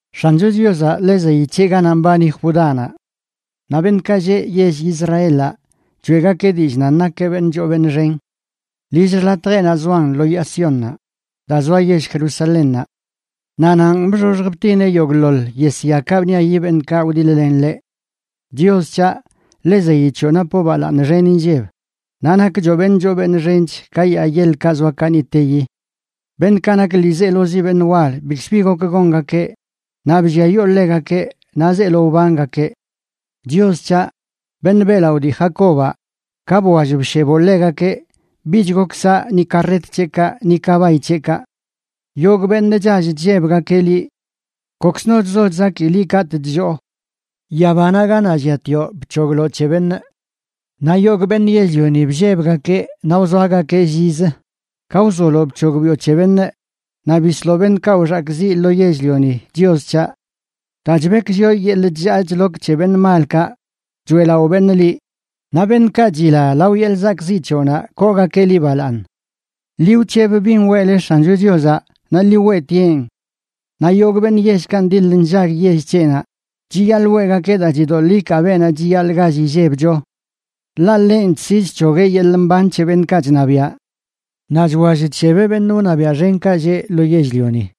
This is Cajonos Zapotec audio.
X̱ancho Chiozaꞌ ḻe zeyi c̱heꞌ ganaꞌ mbani Judánaꞌ; naꞌ beṉꞌkaꞌ lleꞌ yell Israelaꞌ choeꞌgakeꞌ dillꞌ nan nakeꞌ beṉꞌ choo beṉꞌ xen. Lill xḻatjeꞌnaꞌ zoan lo Yaa Siónnaꞌ, daa zoa yell Jerusalénnaꞌ. Naꞌ nanꞌ bxoxj btineꞌ yogꞌḻoḻ yesyakaꞌ bṉiayi beṉꞌkaꞌ wdiḻ-len ḻeꞌ. Chios c̱haꞌ, ḻe zeyi c̱hoꞌ napoꞌ balaaṉ xen inlleb, naꞌ nakchoꞌ beṉꞌ choo beṉꞌ xench ka yaa yeḻkaꞌ zoa kaniꞌteyi. Beṉꞌkaꞌ nak ḻiizelozi beṉꞌ wal bikzbi gok gongakeꞌ naꞌ blliayoo ḻegakeꞌ, naꞌ zeelo wbangakeꞌ. Chios c̱haꞌ, beṉꞌ beꞌlaꞌo dii Jacobaꞌ, ka bwall bsheboꞌ ḻegakeꞌ bich gok saꞌ ni karret c̱heꞌkaꞌ ni kabay c̱heꞌkaꞌ. ¡Yogꞌ beṉꞌ chall chllebgakeꞌ liꞌ! Kokzno chzo chzaki liꞌ katꞌ chlloo. Yabanaꞌ ganaꞌ lliatioꞌ bc̱hogloꞌ c̱he beṉꞌ. Naꞌ yogꞌ beṉꞌ yell-lioni bllebgakeꞌ naꞌ wzoagakeꞌ llizə, ka wzoloꞌ bc̱hogbiꞌo c̱he beṉꞌ naꞌ bisloꞌ beṉꞌkaꞌ wxakꞌziꞌ lo yell-lioni, Chios c̱haꞌ. Daa chbekwllioꞌ yeḻꞌ chllaa chlok c̱he beṉꞌ malkaꞌ, choeꞌlaꞌo beṉꞌ liꞌ; naꞌ beṉꞌkaꞌ chila lao yeḻꞌ zakꞌziꞌ c̱hoꞌnaꞌ koogakeꞌ liꞌ balaaṉ. Ḻi wc̱heb bin weꞌleꞌ X̱ancho Chiozaꞌ naꞌ ḻi weꞌtieꞌn; naꞌ yogꞌ beṉꞌ yellkaꞌ ṉdil nllag yell c̱heꞌnaꞌ chiyaḻꞌ weꞌgakeꞌ daa chidoḻꞌ ikaa beenaꞌ chiyaḻꞌ gall illebcho. Ḻaꞌ ḻenꞌ chsi chc̱hogueꞌ yeḻꞌ mban c̱he beṉꞌkaꞌ chṉabiaꞌ; naꞌ chwall chshebeꞌ beṉꞌ wṉabiaꞌ xenkaꞌ lleꞌ lo yell-lioni.